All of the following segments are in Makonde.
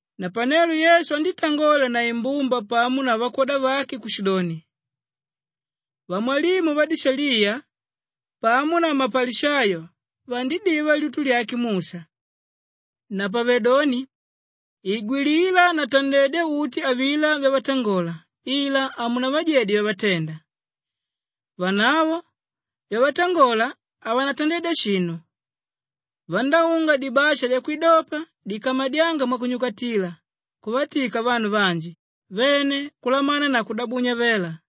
Napanelo Yesu andítangola na imbumba pamo na vakwoda vake kushidoni, “Vamwalimu vadishaliya pamo na mapalishayo vandidiva lyutu lyake Musha. Napavedoni igwilila na tandedya uti avilá vyavatangola ila hamunavajedye vyavatenda. Vanavo vyavatangola havanatandedya shinu. Vandáunga dibasha dyakwidopa dikamadyánga mwakunyakatila kuvatika vanu vanji vene kulamana na kudabunya vela.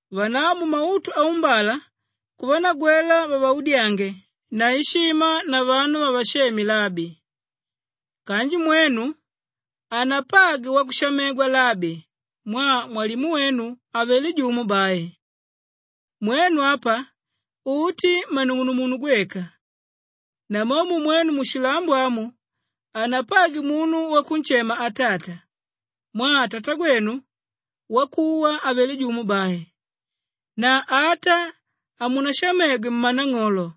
Vanavo mumautu aumbala kuvanagwela vavaudyange na ishima na vanu vavasheme ‘Labi.’ Kanji mwenu hanapagwe wakushamegwa ‘Labi’ mwaa mwalimu wenu avelé jumo bai. Mwenu apa uti mmanung'unumunu gweka. Namomo mwenu mushilambo amu hanapagwe munu wakunshema ‘Atata’ mwaa Tatagwenu wakuwa avelé jumo bai. Na ata hamunashamegwe ‘Mmanang'olo’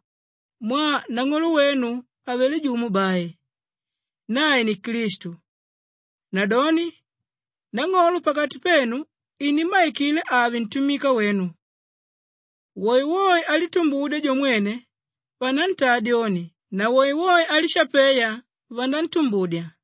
mwaa nang'olo wenu avelé jumo bai, nae ni Klistu. Nadoni nang'olo pakati penu inimmaikila ave ntumika wenu. Woewoe álitumbudya jo mwene, vanantaa dyoni na woewoe álishapeya, vanantumbudya.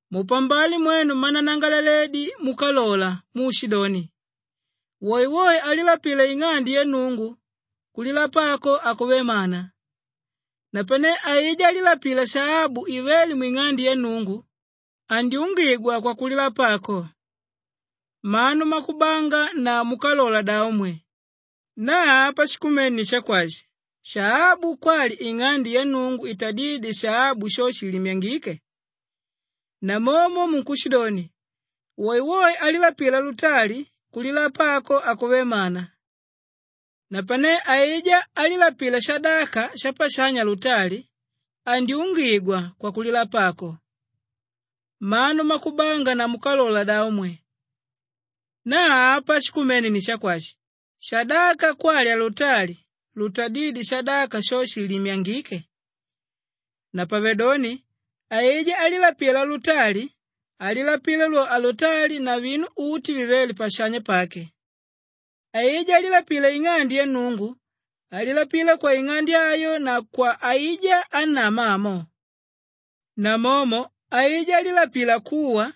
“Mupambale mwenu mmananangalaledi múkalola muushidoni, ‘Woewoe álilapila ing'ande ya Nnungu, kulilapa ako hakuvé mana, napane aijá álilapila shaabu ivéle mwing'ande yake Nnungu, andyungigwa kwakulilapa ako.’ Mmanu mmakubanga na múkalola davo mwe! Na apa shikumene ni shakwashi, shaabu kwali ing'ande ya Nnungu itadídye shaabu sho shiilimyangike? Namomo munkushidoni, ‘Woewoe álilapila alutali, kulilapa ako hakuvé mana, napane aijá álilapila shadaka shapashanya alutali, andyungigwa kwakulilapa ako.’ Mmanu mmakubanga na múkalola davo mwe! Na apa shikumene ni shakwashi, shadaka kwali alutali lutadídye shadaka sho shiilimyangike? Napavedoni aijá álilapila alutali, alilapila lwo alutali na vinu uti vivéle pashanya pake. Aijá álilapila ing'ande ya Nnungu alilapila kwaing'ande ayo na kwa aijá ánama amo. Namomo aijá álilapila kuwa,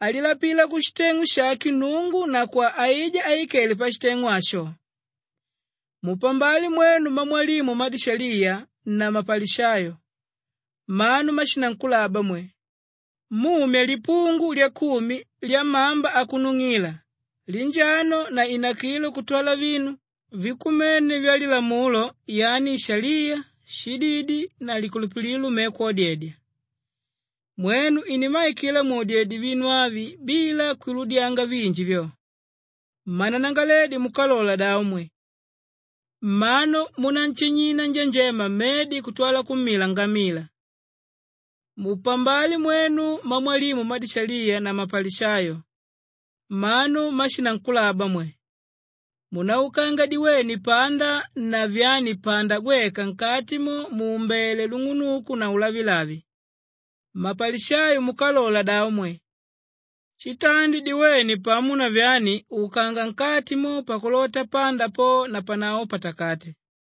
alilapila kushiteng'u shake Nnungu na kwa aijá áikele pashiteng'u asho. “Mupambale mwenu mmamwalimu mmadishaliya na mmapalishayo. Mmanu mmashinankulaba mwe! Mumya lipungu lyakumi lyamamba akunung'ila, linjano na inakilo kutwala vinu vikumene vya Lilamulo yani ishaliya, shididi na likulupililo, me kwodedya. Mwenu inimmaikila mwodedye vinu avi bila kwiludyanga vinji vyo. Mmananangalaledi múkalola davo mwe! Mmanu múnanshinyina njanjema mmedi kutwala kummila ngamila. “Mupambale mwenu mmamwalimu mmadishaliya na mapalishayo. Mmanu mmashinankulaba mwe! Munáukanga diwene pamo na vyani panda gweka nkati mo muumbele lung'unuku na ulavilavi. Mmapalishayo múkalola davo mwe! Shitandi diwene pamo na vyani, ukanga nkati mo pakulota panda po napanavo, patakate.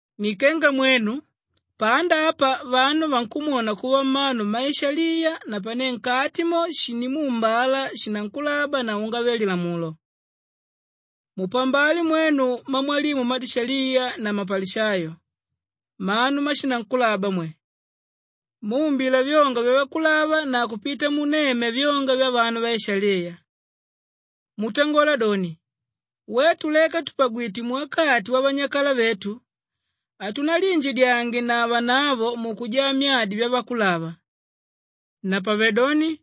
Ni kenga mwenu panda apa vanu vankumwona kuva mmanu mmaishaliya napane nkati mo, shindimuumbala shinankulaba na ungave-lilamulo. “Mupambale mwenu mmamwalimu mmadishaliya na mmapalishayo. Mmanu mmashinankulaba mwe! Muumbila vyonga vyavakulava na kupita munemya vyonga vyavanu vaishaliya. Mutangola doni, ‘Wetu leka tùpagwite muwakati wavanyakala vetu, hatunaliinjidyange na vanavo mukujaa myadi vyavakulava.’ Napavedoni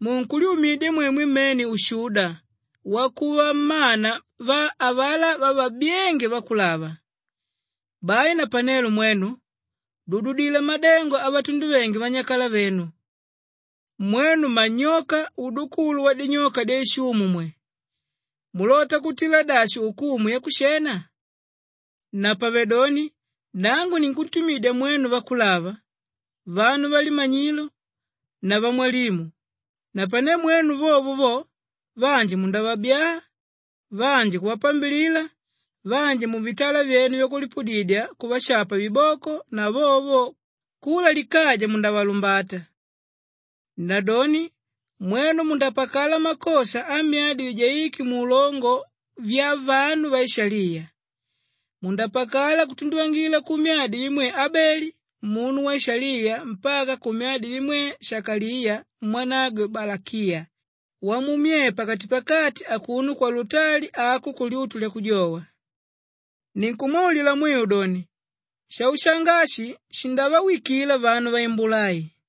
munkulyumidya mwemwe mmene ushuda wakuva mmana va avalá vavabyénge vakulava. Bai napanelo mwenu dududila madengo avatunduvenge vanyakalavenu. “Mwenu mmanyoka, udukulu wadinyoka dyaishumu mwe! Mulota kutila dashi ukumu yakushena? Napavedoni nangu ninkuntumididya mwenu vakulava, vanu valimanyilo na vamwalimu. Napane mwenu vovo vo, vanji mundavabyaa, vanji kuvapambilila, vanji muvitala vyenu vyakulipudidya kuvashapa viboko na vovo vo, kula likaja mundavalumbata. Nadoni mwenu mundapakala makosha amyadi vijaíke muulongo vyavanu vaishaliya. Mundapakala kutunduvangila kumyadi vimwe Abeli munu waishaliya mpaka kumyadi vimwe Shakaliya mwanagwe Balakiya wamummyee pakatipakati akuno kwalutali ako kulyutu lyakujowa. Ninkumwaulila mwiu doni, shaushanga ashi shindavawikila vanu vaimbula ai.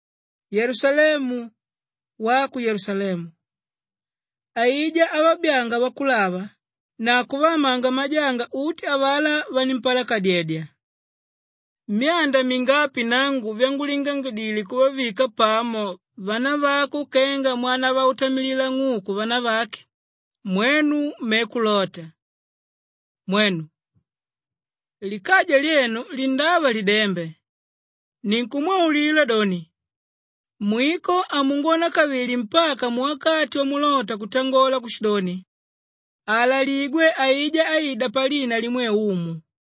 “Yelusalemu, wako Yelusalemu! Aijá ávabyaanga vakulava na kuvaamanga majanga uti avalá vanimpalakadedya. Myanda mingapi nangu vyangulingangidile kuvavika pamo vanavako kenga mwanavautamilila ng'uku vanavake, mwenu me kulota! Mwenu! Likaja lyenu lindava lidembe. Ninkumwaulila doni, mwiko hamungwona kavili mpaka muwakati wamulota kutangola kushidoni, ‘Aalaligwe aijá áida palina limwe Umu.’”